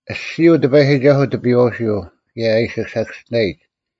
ᐊᔅᒋᔪᐤ ᑎᐸᔨᒋᒐᓱᐤ ᑎᐱᔨᐛᐅᓯᐤ, ᑭᔭ ᐊ ᐃᓯ ᓴᑭᔅᒋᓇᔨᒡ: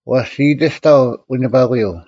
ᐛᔅ ᒋ ᐃᑎᔅᑕᐤ ᐎᓂᐸᑯᔪᐤ,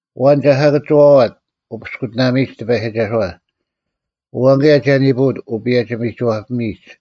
ᐊᐛᓐ ᒐ ᓴᑭᒋᐛᐛᑦ ᐅᐱᔅᑯᑎᓇᒥᔨᒡ ᑎᐸᔨᒋᒐᓱᐛ? ᐊᐛᓐ ᑭᔭ ᒐ ᓂᐳᐅᑦ ᐅᐸᔭᒋ-ᒥᒋᐛᐱᒥᔨᒡ?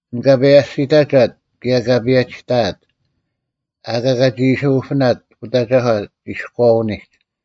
ᐊᓐ ᑲ ᐸᔭᒋᔅᑕᒐᑦ, ᑭᔭ ᑲ ᐸᔭᒋᑕᐊᑦ; ᐊᑲ ᑲᒋ ᐃᓯ ᐅᐱᓇᑦ ᐅᑦ ᐊᒐᒂ ᒋᔎᐅᓂᒡ,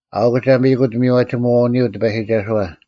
ᐊᐅᒄ ᒐ ᒥᔨᑯᑦ ᒥᔽᒋᒧᐛᐅᓂᔪᐤ ᑎᐸᔨᒋᒐᓱᐛ,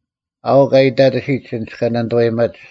ᐊᐅᒄ ᐊ ᐃᑕᑎᓯᒡ ᐊᓐᒡ ᑲ ᓇᓂᑐᐛᔨᒪᒡ,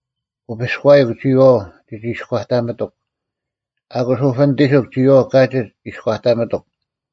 ᐅᐱᔎᔨᒄ, ᒋᔨᐛᐤ ᒋᒋᐃᔎᑕᒪᑎᒄ; ᐊᑯᔅ ᐅᐱᓂᑎᓱᒄ ᒋᔨᐛᐤ ᑲᒋᒡ ᐃᔎᑕᒪᑎᒄ;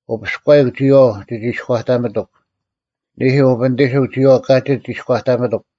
ᐅᐱᔎᔨᐧᒄ, ᒋᔨᐛᐤ ᒋᒋᐃᔎᑕᒪᑎᒄ; ᓂᐦᐃ ᐅᐱᓂᑎᓱᒄ ᒋᔨᐛᐤ ᑲᒋᒡ ᐃᔎᑕᒪᑎᒄ;